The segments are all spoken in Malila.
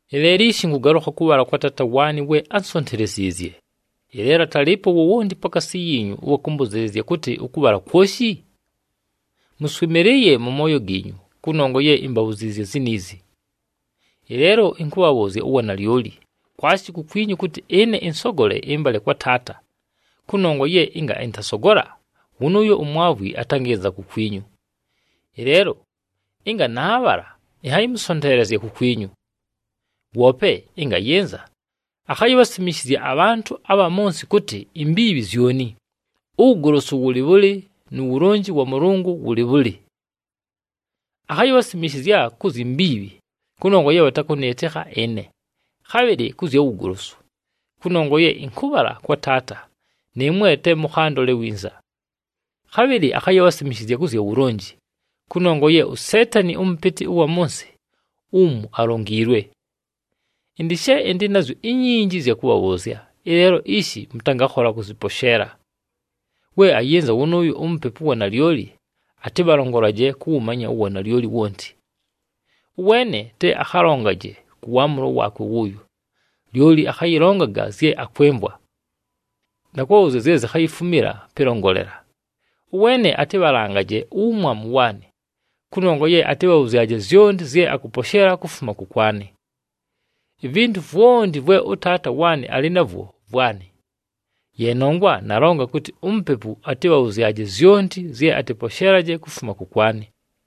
“Ɨleelo ishi ɨnkʉgalʉkha kʉbhala kwa Taata waanɨ we ánsonteleziizye. Ɨleelo atalɨɨpo wowonti pakaasi yiinyu ʉwa kʉmbʉzɨɨlɨzya kʉtɨ, ‘Ʉkʉbhala kwoshi?’ Mʉswɨmɨlɨɨye mʉ mooyo giinyu kʉnongwa ye imbabhuziizye ziniizi. Ɨleelo ɨnkʉbhabhʉʉzya uwanalyoli, kwashi kukwinyu kʉtɨ ɨne ɨnsogole ɨmbale kwa Taata, kʉnongwa ye ɨnga ɨntasogola, wʉnʉʉyo uMwavwi atangɨnza kukwinyu. Ɨleelo ɨnga naabhala, ɨnhayɨmʉsonteelezya kukwinyu. Woope ɨnga ayɨnza, akhayibhasimishizya abhantʉ abha mʉ nsɨ kʉtɨ imbiibhi zyoni, uwugolosu wʉlɨ bhʉlɨ nu wulonji wa Mʉlʉngʉ wʉlɨ bhʉlɨ. Akhayibhasimishizya ku zyi mbiibhi, kʉnongwa ye bhatakʉnɨɨtɨkha ɨne. Khabhɨlɨ kʉ zya wugolosu, kʉnongwa ye ɨnkʉbhala kwa Taata, nɨɨmwe te mʉkhandole winza. Khabhɨlɨ akhayibhasimishizya kʉ zya wulonji, kʉnongwa ye uSeetani ʉmʉpɨtɨ ʉwa mʉ nsɨ umu alongiilwe. “Ɨndɨ she ɨndɨ nazyo inyinji ɨzya kʉbhabhʉʉzya, ɨleelo ishi mʉtangakhola kʉzɨposheela. We ayɨnza wʉnʉʉyo uMupepu ʉwa nalyoli, atɨbhalongolaje kʉwʉmanya uwanalyoli wonti. Ʉweene te akhalongaje kʉ waamʉlo waakwe wʉʉyo, lyoli akhayɨlongaga zye akwɨmvwa, na kʉbhabhʉʉzya zye zikhayifumila pɨlongolela. Ʉweene atɨbhalangaje uwumwamu waanɨ, kʉnongwa ye atɨbhabhʉzyaje zyonti zye akʉposheela kufuma kʉkwanɨ. Ivintu vwonti vwe ʉTaata waanɨ alɨ navwo vwanɨ. Ye nongwa nalonga kʉtɨ uMupepu atɨbhabhʉzyaje zyonti zye atɨposheelaje kufuma kʉkwanɨ.”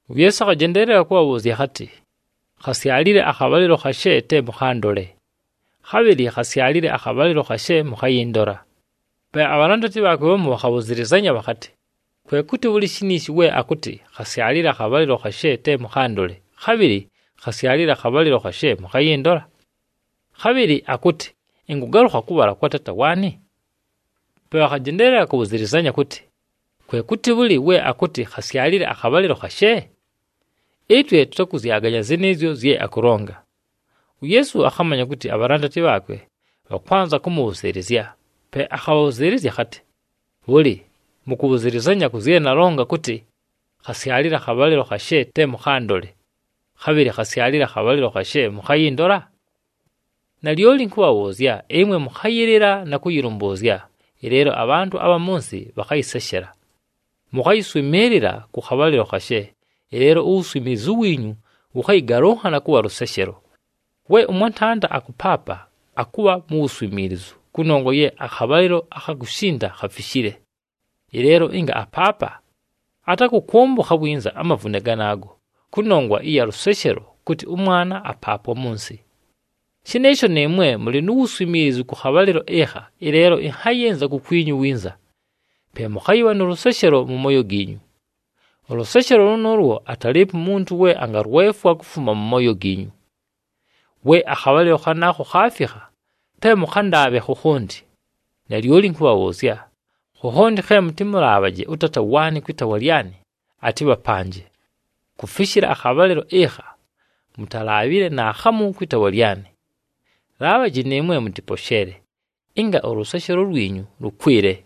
UYeesu akhajendeelela kʉbhabhʉʉzya akhatɨ, “Khasyalile akhabhalɨlo khashe te mʉkhandole, khabhɨlɨ khasyalile akhabhalɨlo khashe mʉkhayɨndola.” Pe abhalandati bhaakwe bhamu bhakhabhʉzɨlɨzanya bhakhatɨ, “Kwe kʉtɨ bhʉlɨ shiniishi we akʉtɨ, ‘Khasyalile akhabhalɨlo khashe te mʉkhandole, khabhɨlɨ khasyalile akhabhalɨlo khashe mʉkhayɨndola,’ khabhɨlɨ akʉtɨ, ‘Ɨnkʉgalʉkha kʉbhala kwa Taata waanɨ’?” Pe bhakhajendeelela kʉbhʉzɨlɨzanya kʉtɨ, “Kwe kʉtɨ bhʉlɨ we akʉtɨ, ‘Khasyalile akhabhalɨlo khashe’? Ɨtwe tʉtakʉzyaganya zɨnɨɨzyo zye akʉlonga.” UYeesu akhamanya kʉtɨ abhalandati bhaakwe bhakwanza kʉmʉbhʉzɨɨlɨzya, pe akhabhabhʉzɨɨlɨzya akhatɨ, “Bhʉlɨ, mʉkʉbhʉzɨlɨzanya kʉ zye nalonga kʉtɨ, ‘Khasyalile akhabhalɨlo khashe te mʉkhandole, khabhɨlɨ khasyalile akhabhalɨlo khashe mʉkhayɨndola’? Nalyoli ɨnkʉbhabhʉʉzya, ɨmwe mʉkhayɨlɨla na kʉyɨlʉmbʉʉzya, ɨleelo abhantʉ abha mʉ nsɨ bhakhayɨseshela. Mʉkhayɨswɨmɨɨlɨla kʉ khabhalɨlo khashe, ɨleelo uwuswimiilizu wiinyu wʉkhayɨgalʉnhana kʉbha lʉseshelo. We ʉmwantanda akʉpaapa, akʉbha nu wuswimiilizu kʉnongwa ye akhabhalɨlo akha kushinda khafishile. Ɨleelo ɨnga apaapa, atakʉkʉmbʉkha winza amavune ganaago, kʉnongwa ɨya lʉseshelo kʉtɨ ʉmwana apaapwa mʉ nsɨ. Shɨnɨɨsho nɨɨmwe mʉlɨ nu wuswimiilizu kʉ khabhalɨlo ɨkha, ɨleelo ɨnhayɨnza kukwinyu winza, pe mʉkhayɨbha nʉ lʉseshelo mʉ mooyo giinyu. Ʉlʉseshelo lʉnʉʉlwo atalɨɨpo umuntu we angalwefwa kufuma mʉ mooyo giinyu. We akhabhalɨlo khanaakho khaafikha, te mʉkhandaabhe khokhonti. Nalyoli ɨnkʉbhabhʉʉzya, khokhonti khe mʉtɨmʉlaabhaje ʉTaata waanɨ kwɨ taawa lyanɨ, atɨbhapanje. Kufishila akhabhalɨlo ɨkha, mutalaabhile naakhamu kwɨ taawa lyanɨ. Laabhaji nɨɨmwe mʉtɨposheele, ɨnga ʉlʉseshelo lwinyu lʉkwɨle.”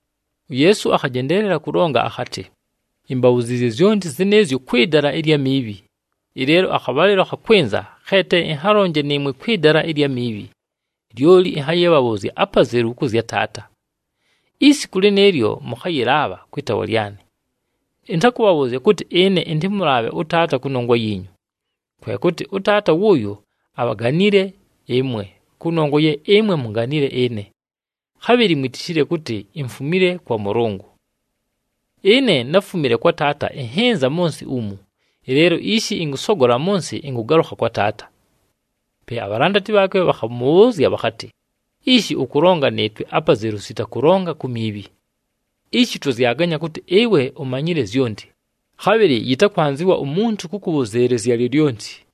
UYeesu akhajendeelela kʉlonga akhatɨ, “Imbabhuziizye zyonti zɨnɨɨzyo kwɨ dala ɨlya miibhi. Ɨleelo akhabhalɨlo khakwɨnza khe te ɨnhalonje nɨɨmwe kwɨ dala ɨlya miibhi, lyoli ɨnhayɨbhabhʉʉzya apazelu kʉ zya Taata. Isiku lɨnɨɨlyo, mʉkhayɨlaabha kwɨ taawa lyanɨ. Ɨntakʉbhabhʉʉzya kʉtɨ ɨne ɨntɨmʉlaabhe ʉTaata kʉnongwa yiinyu. Kwe kʉtɨ ʉTaata wʉʉyo abhaganile ɨmwe kʉnongwa ye ɨmwe munganile ɨne, khabhɨlɨ mwitishile kʉtɨ imfumile kwa Mʉlʉngʉ. Ɨne náfumile kwa Taata ɨnhɨnza mʉ nsɨ umu, ɨleelo ishi ɨnkʉsogola mʉ nsɨ, ɨnkʉgalʉkha kwa Taata.” Pe abhalandati bhaakwe bhakhamʉbhʉʉzya bhakhatɨ, “Ishi ʉkʉlonga nɨɨtwe apazelu sita kʉlonga ku miibhi! Ishi twazyaganya kʉtɨ ɨwe umanyile zyonti, khabhɨlɨ yɨtakwanzɨwa umuntu kʉkʉbhʉzɨɨlɨzya lyolyonti.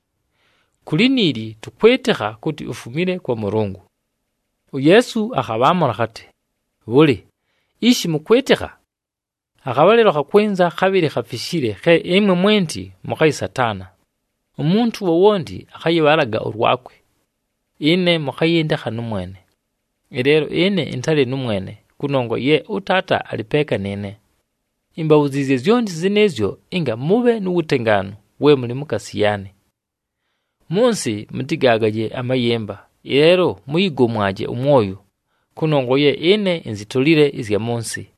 Ku liniili tʉkwɨtɨkha kʉtɨ ufumile kwa Mʉlʉngʉ.” UYeesu akhabhaamʉla akhatɨ, “Bhʉlɨ, ishi mʉkwɨtɨkha? Akhabhalɨlo khakwɨnza, khabhɨlɨ khafishile khe ɨmwe mwenti mʉkhayɨsataana. Umuntu wowonti akhayɨbhalaga ʉlwakwe, ɨne mʉkhayɨndekha nʉmwene. Ɨleelo ɨne ɨntalɨ nʉmwene, kʉnongwa ye ʉTaata alɨ peeka nɨɨne. Imbabhuziizye zyonti zɨnɨɨzyo ɨnga mʉbhe nu wutengaanu we mʉlɨ mukaasi yaanɨ. Mʉ nsɨ mʉtɨgaagaje amayɨmba, ɨleelo mʉyɨgomwaje ʉmwoyo, kʉnongwa ye ɨne inzitolile ɨzya mʉ nsɨ.”